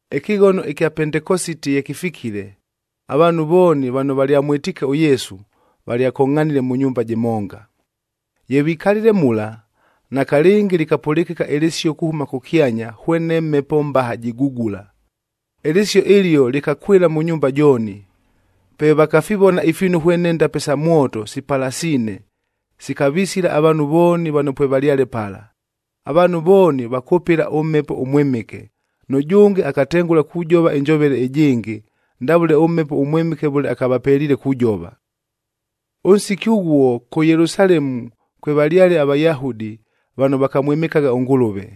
Ɨkɨghono ɨkya Pentekositia ye kɨfikile, avaanhu vooni vano valyamwɨtiike ʉYesu, valyakongʼhanile mʉ nyumba jɨmonga. Ye vikalile mula, nakalɨngi lɨkapʉlɨkɨka ɨlɨsio kuhʉma kʉkyanya hwene mhepo mbaha jigugula. Ɨlɨsio ɨlio lɨkakwɨla mʉ nyumba jooni. Pe vakafivona ifiinu hwene ndape sa mwoto sipalasiine, sikavisila avaanhu vooni vano pwevalyale pala. Avaanhu vooni vakʉpɨla ʉMhepo ʉMwɨmɨke, nʉjʉnge akatengʉla kujova ɨnjovele ɨjɨngɨ, ndavʉle ʉMhepo ʉMwɨmɨke vʉle akavapeliile kujova. Ʉnsiki ʉghuo, kʉ Yelusalemu kwevalyale aVayahudi vano vakamwɨmɨkagha ʉNgʉlʉve.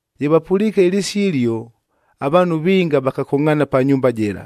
Ye vapʉliike ɨlɨsio ɨlio, avaanhu vinga vakakongʼhaana pa nyumba jɨla.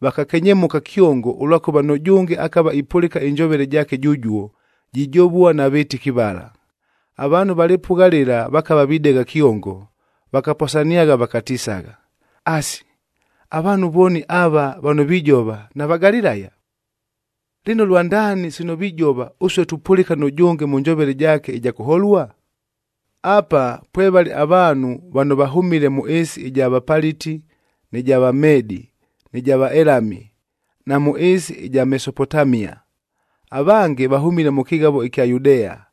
Vakakenyemʉka kyongo ʉlwakʉva nʉjʉnge akava ipʉlɨka ɨnjovele jaake jʉjuo, jijovua na vɨtɨki vala. Avaanhu va lɨpʉgha lɨla vakava videgha kyongo, vakaposaniagha vakatisagha, “Asi, avaanhu vooni ava vano vijova, naVagalilaya? Lɨno lwandaani sino vijova, ʉsue tupʉlɨka nʉjʉnge mʉ njovele jaake ɨja kʉholua? Apa, pwevale avaanhu vano vahʉmile mʉ ɨɨsi ɨja Vapaliti, nɨ ja Vamedi, nɨ ja Vaelami na mʉ ɨɨsi ɨja Mesopotamia. Avange vahʉmile mʉ kɨghavoc ɨkya Yudea,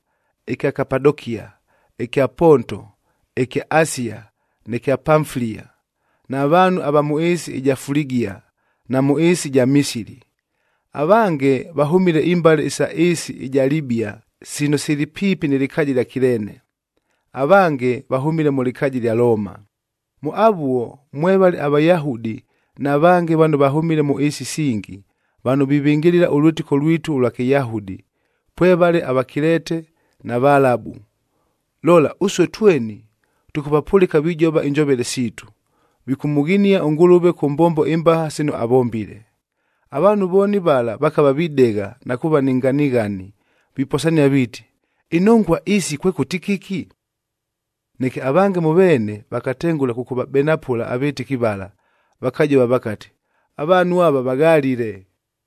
ɨkya Kapadokia, ɨkya Ponto, ɨkya Asia, nɨ kya Pamfilia, na vaanhu ava mʉ ɨɨsi ɨja Fuligia, na mʉ ɨɨsi ɨja Misili. Avange vahʉmile imbale isa ɨɨsi ɨja Libia sino sili piipi nɨ lɨkaaja ɨlya Kileene, avange vahʉmile mʉ lɨkaaja ɨlya Looma. Mʉ avuo mwevale aVayahudi na vange vano vahʉmile mʉ ɨɨsi isingi, vano vivɨngɨlɨla ʉlwɨtɨko lwitu ʉlwa Kɨyahudi, pwevale aVakilete na Valabu. Lola, ʉsue tweni tʉkʉvapʉlɨka vijova injovele siitu, vikʉmʉghinia ʉNgʉlʉve kʉ mbombo imbaha sino avombile!” Avaanhu vooni vala vakava videgha na kuuva ni nganighani, viposania viiti, “Inongua isi kwekʉti kɨki?” Neke avange mʉ veene vakatengʉla kʉkʉvabenapʉla avɨtɨki vala, vakajova vakati, “Avaanhu ava vaghalile.”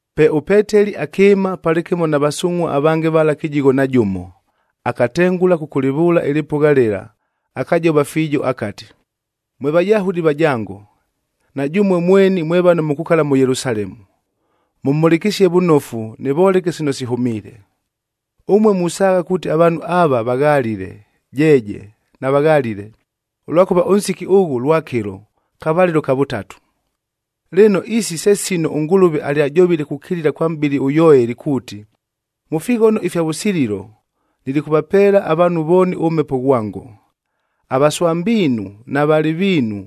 Pe ʉPeteli akɨɨma palɨkɨmo na vasungʼhua avange vala kɨjigho na jʉmo, akatengʉla kʉkʉlɨvʉʉla ɨlɨpʉgha lɨla, akajova fiijo akati, “Mwe Vayahudi vajango, na jʉmue mweni mwe vano mukukala mʉ Yelusalemu, mʉmhʉlɨkɨsie vʉnofu nɨvoleke sino sihʉmiile. Ʉmue musaagha kuuti avaanhu ava vaghalile, jeeje, navaghalile, ʉlwakʉva ʉnsiki ʉghʉ lwakɨlo, kavalɨlo ka vʉtatu! Lɨno, isi se sino ʉNgʉlʉve alyajovile kukilila kwa mʼbɨli ʉYoeli kuuti, ‘Mʉ fighono ifya vʉsililo, nilikʉvapeela avaanhu vooni ʉMhepo ghwango. Avaswambiinu na valɨviinu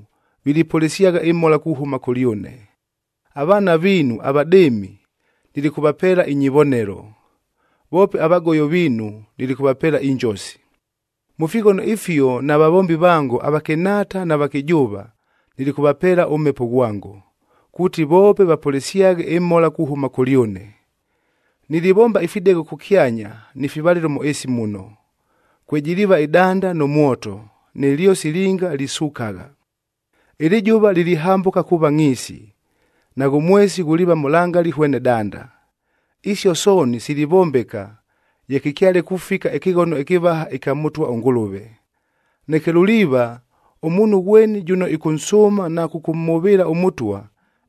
vilipʉlɨsyagha ɨmhola kuhʉma kʉlyʉne, avaana viinu avadɨɨmi nilikʉvapeela inyivonelo, voope avagoyo viinu nilikʉvapeela injosi. Mʉ fighono ifio na vavombi vango, avakɨnhaata na vakɨjʉʉva, nilikʉvapeela ʉMhepo ghwango, kuuti voope vapʉlɨsyaghe ɨmhola kuhʉma kʉlyʉne. Nilivomba ifidegho kʉkyanya, ni fivalɨlo mʉ ɨɨsi muno. Kwejiliiva ɨdanda nʉ mwoto, nɨ lyosi linga lisukagha. Ɨlɨjʉva lilihambʉka kuuva ngʼhiisi, naghʉ mwesi ghuliiva mʉlangali hwene danda. Isio sooni silivombeka ye kɨkyale kufika ɨkɨghono ɨkɨvaha ɨkya Mʉtwa ʉNgʉlʉve. Neke luliiva, ʉmuunhu ghweni jʉno ɨkʉnsʉʉma na kʉkʉmhʉvɨɨla ʉMʉtwa,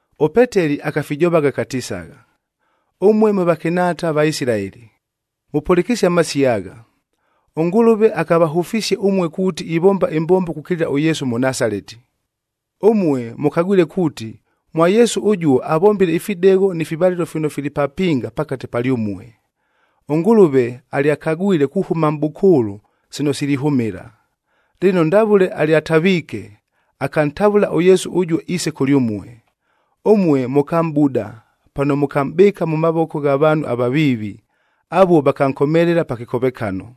ɄPeteli akafijovagha akatisagha, “Ʉmue mwe vakɨnhaata Vaisilaeli, mʉpʉlɨkɨsie amasio agha! ɄNgʉlʉve akavahʉfisie ʉmue kuuti ivomba ɨmbombo kukilila ʉYesu ʉMʉnasaleti. Ʉmue mʉkagwile kuuti, mwa Yesu ʉjuo avombile ifidegho ni fivalɨlo fino fili papinga pakate palyʉmue. ɄNgʉlʉve alyakagwile kuhʉma mʼbʉkʉʉlʉ sino silihʉmɨla. Lɨno ndavʉle alyataviike, akantavʉla ʉYesu ʉjuo iise kʉlyʉmue. Ʉmue mʉkamʼbuda pano mʉkamʼbɨɨka mʉ mavoko gha vaanhu avaviivi,e avuo vakankomelela pa kɨkovekano.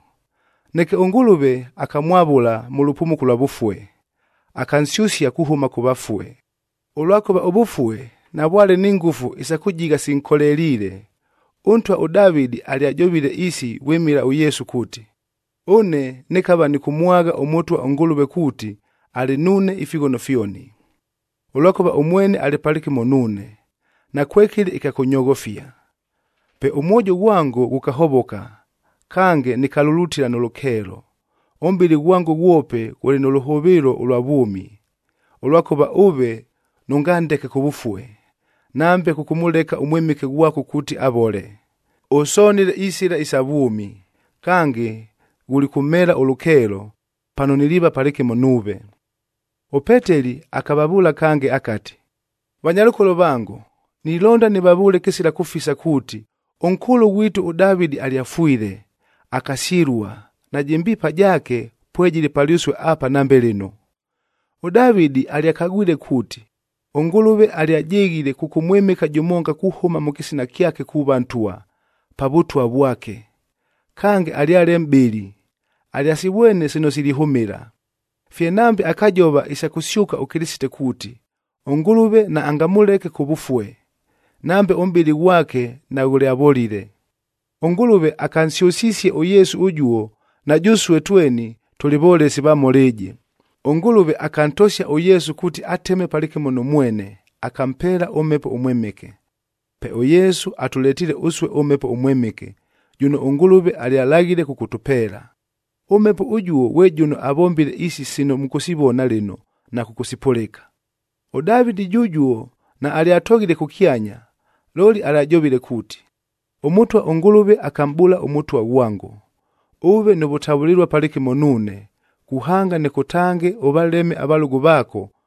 Neke ʉNgʉlʉve akamwavʉla mʉ lʉpumuko ʉlwa vʉfue, akansyʉsia kuhʉma kʉ vafue, ʉlwakʉva ʉvʉfue navwale ni ngʉfu isa kʉjigha sinkoleliile. Ʉntwa ʉDavɨdi alyajovile isi vwɨmɨla ʉYesu kuuti, ‘Ʉne nɨkava nɨkʉmwagha ʉMʉtwa ʉNgʉlʉve kuuti alɨ nuune ifighono fyoni. Ʉlwakʉva ʉmwene alɨ palɨkɨmo nuune, nakwekɨlɨ ɨkya kʉnyoghofia. Pe ʉmwojo ghwango ghʉkahovoka, kange nɨkalulutila nʉ lʉkeelo. Ʉmʼbɨlɨ ghwango ghwope ghʉlɨ nʉ lʉhʉvɨɨlo ʉlwa vwʉmi, ʉlwakʉva ʉve nʉngandeke kʉvʉfue, nambe kʉkʉmʉleka ʉMwɨmɨke ghwako kuuti avole. Ʉsonile isɨla isa vwʉmi. Kange ghulikʉmheela ʉlʉkeelo, pano niliiva palɨkɨmo nuuve.’f” ɄPeteli akavavʉʉla kange akati, “Vanyalʉkolo vango, nilonda nɨvavʉʉle kɨsila kʉfisa kuuti, ʉnkʉʉlʉ ghwitu ʉDavɨdi alyafwile, akasyɨlua, najɨ mbiipa jaake pwejɨlɨ palyʉsue apa nambe lɨno. ɄDavɨdi alyakagwile kuuti, ʉNgʉlʉve alyajɨghile kʉkʉmwɨmɨka jʉmonga kuhʉma mʉ kɨsina kyake kuuva ntwa, pa vʉtwa vwake.g Kange alyale mʼbɨli, alyasivwene sino silihʉmɨla, fye nambe akajova isa kʉsyʉka ʉKɨlɨsite kuuti, ʉNgʉlʉve naangamʉleke kʉvʉfue, nambe ʉmʼbɨlɨ ghwake naghʉlyavolile. ɄNgʉlʉve akansyʉsisie ʉYesu ʉjuo, na jʉsue tweni tʉlɨ volesi va mhola ɨjɨ. ɄNgʉlʉve akantosia ʉYesu kuuti ateme palɨkɨmo nʉ mwene,h akampeela ʉMhepo ʉMwɨmɨke. Pe ʉYesu atʉletiile ʉsue ʉMhepo ʉMwɨmɨke, jʉno ʉNgʉlʉve alyalaghile kʉkʉtʉpeela. ɄMhepo ʉjuo ghwe jʉno avombile isi sino mʉkʉsivona lɨno na kʉkʉsipʉlɨka. ɄDavɨdi jʉjuo naalyatoghile kʉkyanya, looli alyajovile kuuti, ‘ɄMʉtwa ʉNgʉlʉve akamʼbʉʉla ʉMʉtwa ghwango, “Ʉʉve nʉ vʉtavʉlɨlua palɨkɨmo nuune, kuhanga nɨkʉtange ʉvaleme avalʉgʉ vaako,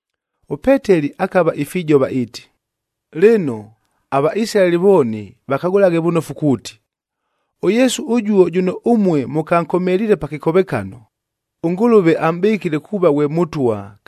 ɄPeteli akava ifijova iiti, “Lɨno, aVaisilaeli vooni vakagʉlaghe vʉnofu kuuti, ʉYesu ʉjuo jʉno ʉmue mʉkankomeliile pa kɨkovekano, ʉNgʉlʉve amʼbɨkile kuuva ghwe Mʉtwa,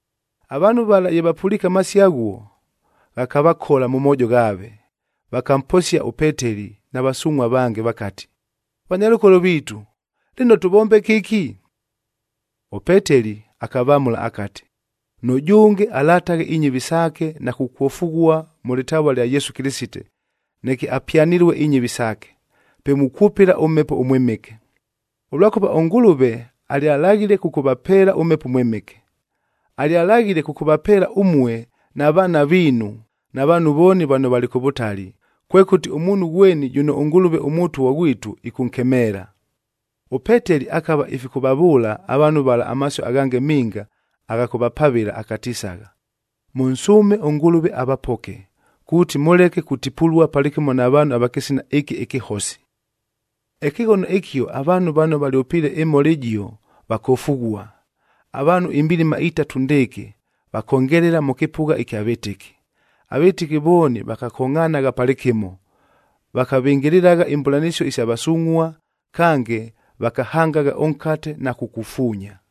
Avaanhu vala ye vapʉliike amasio aghuo, ghakavakola mʉ moojo ghaave. Vakamposia ʉPeteli na vasungʼhua avange vakati, “Vanyalʉkolo viitu, lɨno tʉvombe kɨki?” ɄPeteli akavamʉla akati, “Nʉjʉnge alataghe inyɨvi saake, na kukwofughua mʉ lɨtavua ɨlya Yesu Kɨlɨsite, neke apyanɨlue inyɨvi saake, pe mukwʉpɨla ʉMhepo ʉMwɨmɨke. Ʉlwakʉva ʉNgʉlʉve alyalaghile kʉkʉvapeela ʉMhepo ʉMwɨmɨke. Alyalaghile kʉkʉvapeela ʉmue na vaana viinu na vaanhu vooni vano valɨ kʉ vʉtali, kwekʉti ʉmuunhu ghweni jʉno ʉNgʉlʉve ʉMʉtwa ghwitu ɨkʉnkemeela.” ɄPeteli akava ifikʉvavʉʉla avaanhu vala amasio aghange minga agha kʉvapavɨla akatisagha, “Mʉnsʉʉme ʉNgʉlʉve avapoke, kuuti mʉleke kutipulua palɨkɨmo na vaanhu ava kɨsina ɨkɨ ɨkɨhosi.” Ɨkɨghono ɨkio avaanhu vano valyʉpiile ɨmhola ɨjio, vakofughua. Avaanhu imbilima itatu ndɨɨkɨ vakongelela mʉ kɨpʉgha ɨkya vɨtɨki. Avɨtɨki vooni vakakongʼhanagha palɨkɨmo, vakavɨngɨlɨlagha imbʉlanɨsio isa vasungʼhua, kange vakahangagha ʉnkatel na kukufuunya.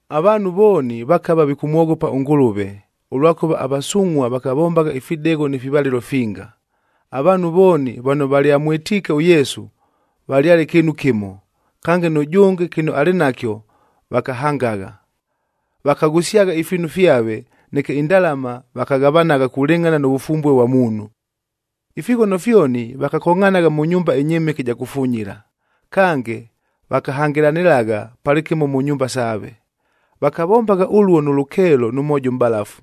Avaanhu vooni vakava vikʉmwoghopa ʉNgʉlʉve, ʉlwakʉva avasungʼhua vakavombagha ifidegho ni fivalɨlo finga. Avaanhu vooni vano valyamwɨtiike ʉYesu, valyale kɨɨnu kɨmo, kange nʉjʉnge kɨno alɨ nakyo, vakahangagha. Vakaghʉsyagha ifiinu fyave, neke indalama vakaghavanagha kulɨngʼhana nʉ vʉfumbue vwa muunhu. Ifighono fyoni vakakongʼhanagha mʉ nyumba ɨnyɨmɨke ɨja kufunyila,m kange vakahangɨlanɨlagha palɨkɨmo mʉ nyumba saave. Vakavombagha ʉluo nʉ lʉkeelo nʉ mwojo ʉmʼbalafu.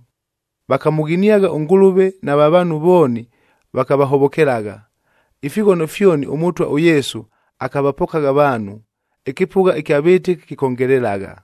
Vakamʉghiniagha ʉNgʉlʉve, nava vaanhu vooni vakavahovokelagha. Ifighono fyoni ʉMʉtwa ʉYesu akavapokagha avaanhu, ɨkɨpʉgha ɨkya vɨtɨki kɨkongelelagha.